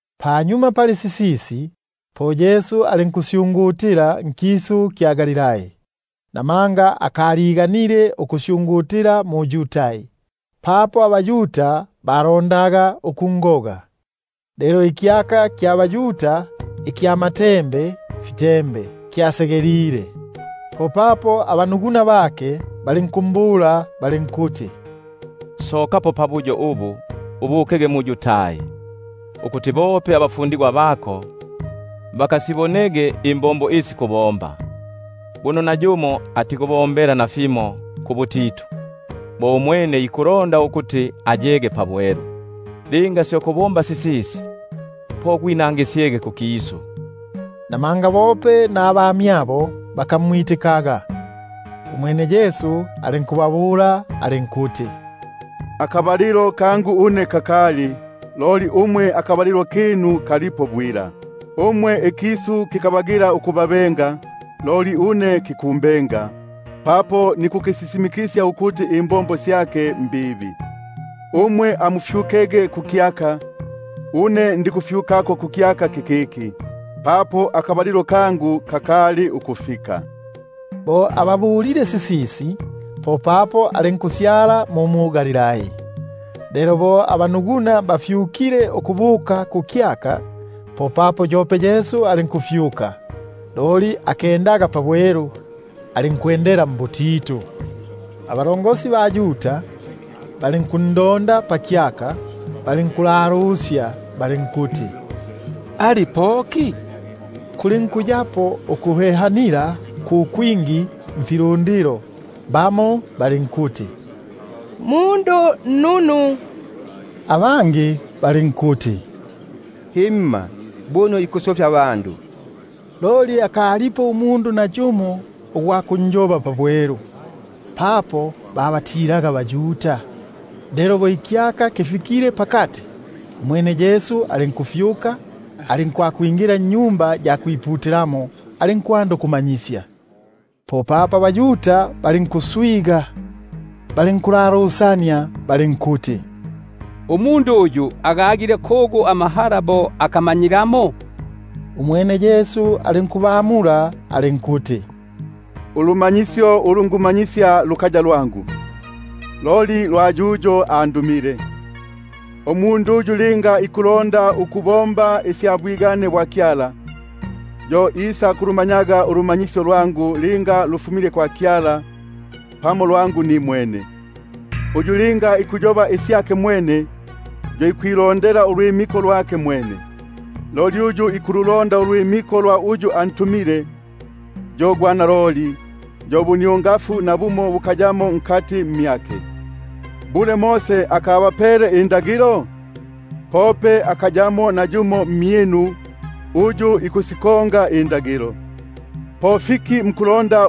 Panyuma pali sisisi, po Yesu alinkusyungutila nkisu kya Galilai; namanga akaliganile ukusyungutila mu-Yudai, papo abaYuda balondaga ukungoga. Lelo ikyaka kya baYuda ikya masasa kyasegelile. Popapo abanuguna bake balinkumbula balinkuti: Sokapo apa ubukege mu-Yudai, ukuti bope abafundigwa bako bakasibonege imbombo isi kubomba. Buno nayumo atikubombela nafimo mbutitu, bo umwene ikulonda ukuti ayege pabwelu; linga syo kubomba sisisi, po gwinangi- syege kukisu. Namanga bope nabanuguna bakamwitikaga. Umwene Yesu alinkubabula alinkuti: Akabalilo kangu kakali, loli umwe akabalilo kinu kalipo bwila. Umwe ikisu kikabagila ukubabenga, loli une kikumbenga, papo nikukisisimi- kisya ukuti imbombo syake mbibi. Umwe amufyukege kukyaka, une ndikufyukako kukyaka kikiki, papo akabalilo kangu kakali ukufikapo. Bo ababulile sisisi, popapo alinku-syala mu mu-Galilai. Lelo bo abanuguna bafyukile ukubuka kukyaka, popapo yope alinkufyuka, alinkusita nukwenda pabwelu, loli alinkwe- ndela mbutitu. Abene abaYuda balinkundonda pakyaka, balinkuyoba balinkuti: Ali kugu umwene? Kulinkuyapo ukuhehanila ku kwingi nifilundilo, bamo balinkuti: Mundu nnunu, abangi balinkuti: Himma, buno ikufisofya ifilundilo. Loli akalipo nayumo ugwa kunjoba pabwelu, papo babatilaga abaYuda. Lelo bo ikyaka lufikile pakati, popapo Yesu alinkufyuka, alinkwingila mwa Tempeli, alinkumanyisya. Popapo abaYuda balinkuswiganika, balinkulalusania balinkuti: Umundu uyu agagile kugu amahala bo akamanyilamo? Umwene Yesu alinkubamula alinkuti: Ulumanyisyo ulu tukumanyisya lukaya lwangu, loli lwa yuyo andumile. Uyu linga ikulonda ukubomba isya bwigane bwake, yo isakulumanyaga ulumanyisyo linga lufumile kwa Kyala, pamo lwangu nimwene. Uyu linga ikuyoba isyake mwene, yo ikwilondela ubukulumba bwake mwene; loli uyu ikubulonda ubukulumba bwa uyu antumile, yo gwa naloli, yo nubuniongafu bukayamo mmyake. Ngimba Mose akabapele ululagilo? Pope akayamo nayumo mmyinu uyu ikulukonga ululagilo. Po fiki mukulonda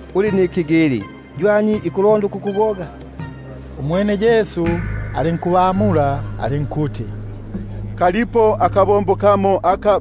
Uli nimbepo inyali; ywani ikulonda ukukugoga? Umwene Yesu alinkubamula alinkuti: Nabombile akabombo kamo,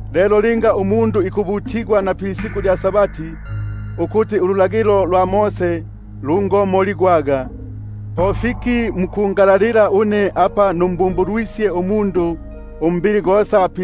Lelo linga umundu ikwambilila ububutigwa pa-Sabati, ukuti ululagilo lwa Mose lungisakomoligwaga, po mwati mungalalilege bo numbumbulwisye pa-Sabati umundu umbili gosa?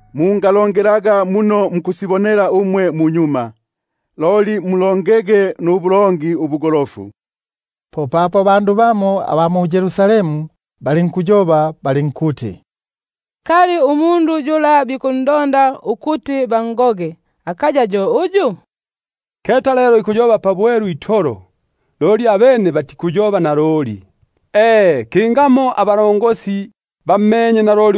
Mungalongelaga mbundu bwa kumaso itolo, loli mulongelege nubulongi ubugolofu. Popapo abandu bamo aba mu-Yerusalemu balinkuyoba balinkuti: Kali akaya yo yuyo, uyu bikundonda ukuti bangoge? Keta lelo ikuyoba pabwelu itolo, loli abene batikuyoba nalimo! E, kingamo abakulumba bammenye naloli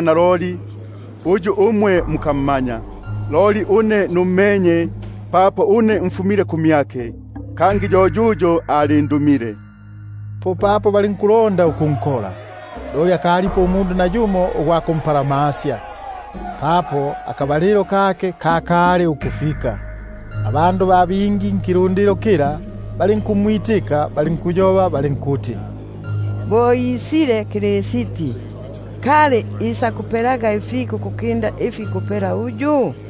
naloli, uyu umwe mukammanya. Une nummenye, papo ko kuno mfumile, kangi yo yuyo alindumile. Popapo balinkulonda ukunkola, loli alinkusita nukuyapo nayumo ugwa kumpalamasya, papo akabalilo kake kakali ukwisa. Abandu ba bingi nkilundilo balinkumwitika, balinkuti: Bo ikwisa Kristi, kali isakupela ifika ukukinda ifi ikupela uyu?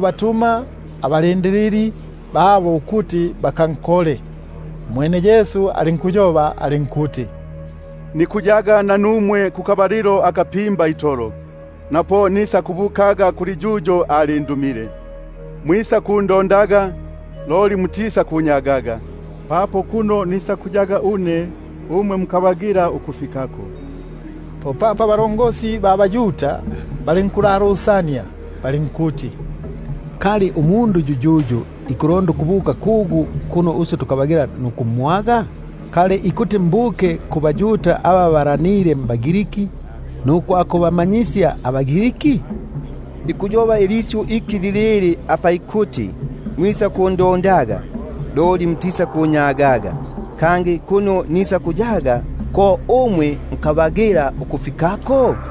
batuma ababombi babo ukuti bakankole. Umwene Yesu alinkuti: Pasyele panandi apa nikuyaga nanumwe, lelo po nisakubukaga kuli yuyo alindumile. Mwisakundondaga, loli mutisakunyagaga; kangi kuno ndiko une, ko mukabagila ukwisako. Popapo abaYuda balinkulalusania balinkuti: Kali ikulonda ukubuka kugu yuyuyu, kuno tukabagila nukumwaga? Kali ikuti mbuke kuli aba babalanile mbaGriki kukubama- nyisya abaGriki? Ikuyoba isyu iki lilili apa ikuti: Mwisakundondaga, loli mutisakunyagaga, kangi kuno ndiko, ko mukabagila ukwisako?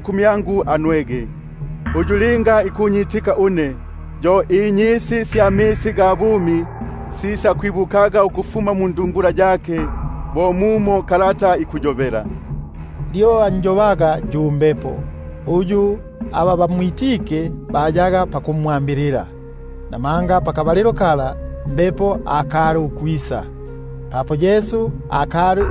kumyangu anwege. Uyu linga ikunyitika une, yo inyisi sya misi amumi sisakwibukaga mmyake, bo mumo kalata ikuyo- bela. Lyo anjobaga yu Mbepo, uyu aba bamwitike hayaga pakumwambilila, namanga Mbepo akali, papo Yesu akali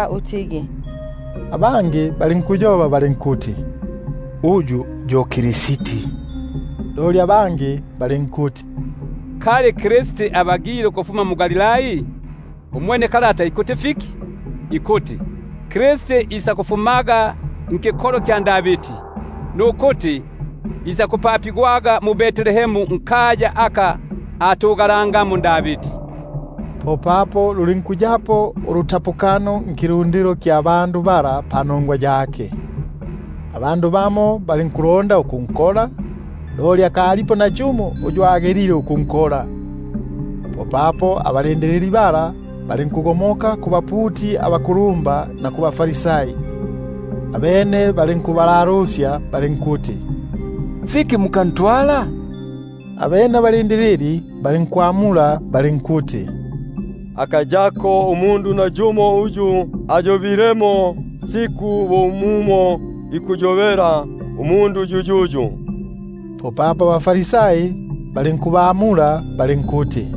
naloli. Abangi balinkuti: Yo yu Kristi; loli abangi balinkuti: Kali Kristi ikufuma mu-Galilai? Ngimba kalata atikuti: Kristi ikufumaga nduyungu lwa Davidi, nukuti ikufumaga mu-Betlehemu nkaya aka ayangamo Davidi? Popapo luli- nkuyapo ulutapukano nkilundilo panongwa yake. Bamo balinkulonda ukunkola, loli alinkusita nukuyapo nayumo ugwa kumpalamasya. Popapo ababombi bala balinkubuka kubaputi abakulumba na kubaFarisai; abene balinkubalalusya balinkuti: Muka- ntwala fiki? Abene ababombi balinkwamula balinkuti: Nayumo umundu akayobamo bo mumo ikuyobela umundu yuyuyu! Popapo abaFarisai balinkubamula balinkuti: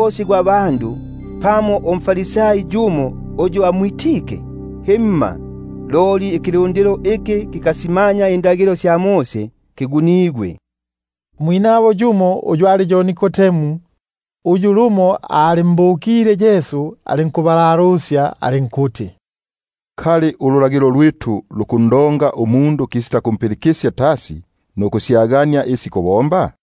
lumba pamo mbaFarisai uyu amwitike? Himma, loli ki kilundilo iki kikasimanya indagilo — kyo kigunigwe. Yumo umwinabo, uyu ali yo Nikodemu, (uyu lumo abukile kumyake) alinkubabula alinkuti: Kali ululagilo lwitu lukundonga umundu kisitakumpilikisya tasi nukumanya isi ikubomba?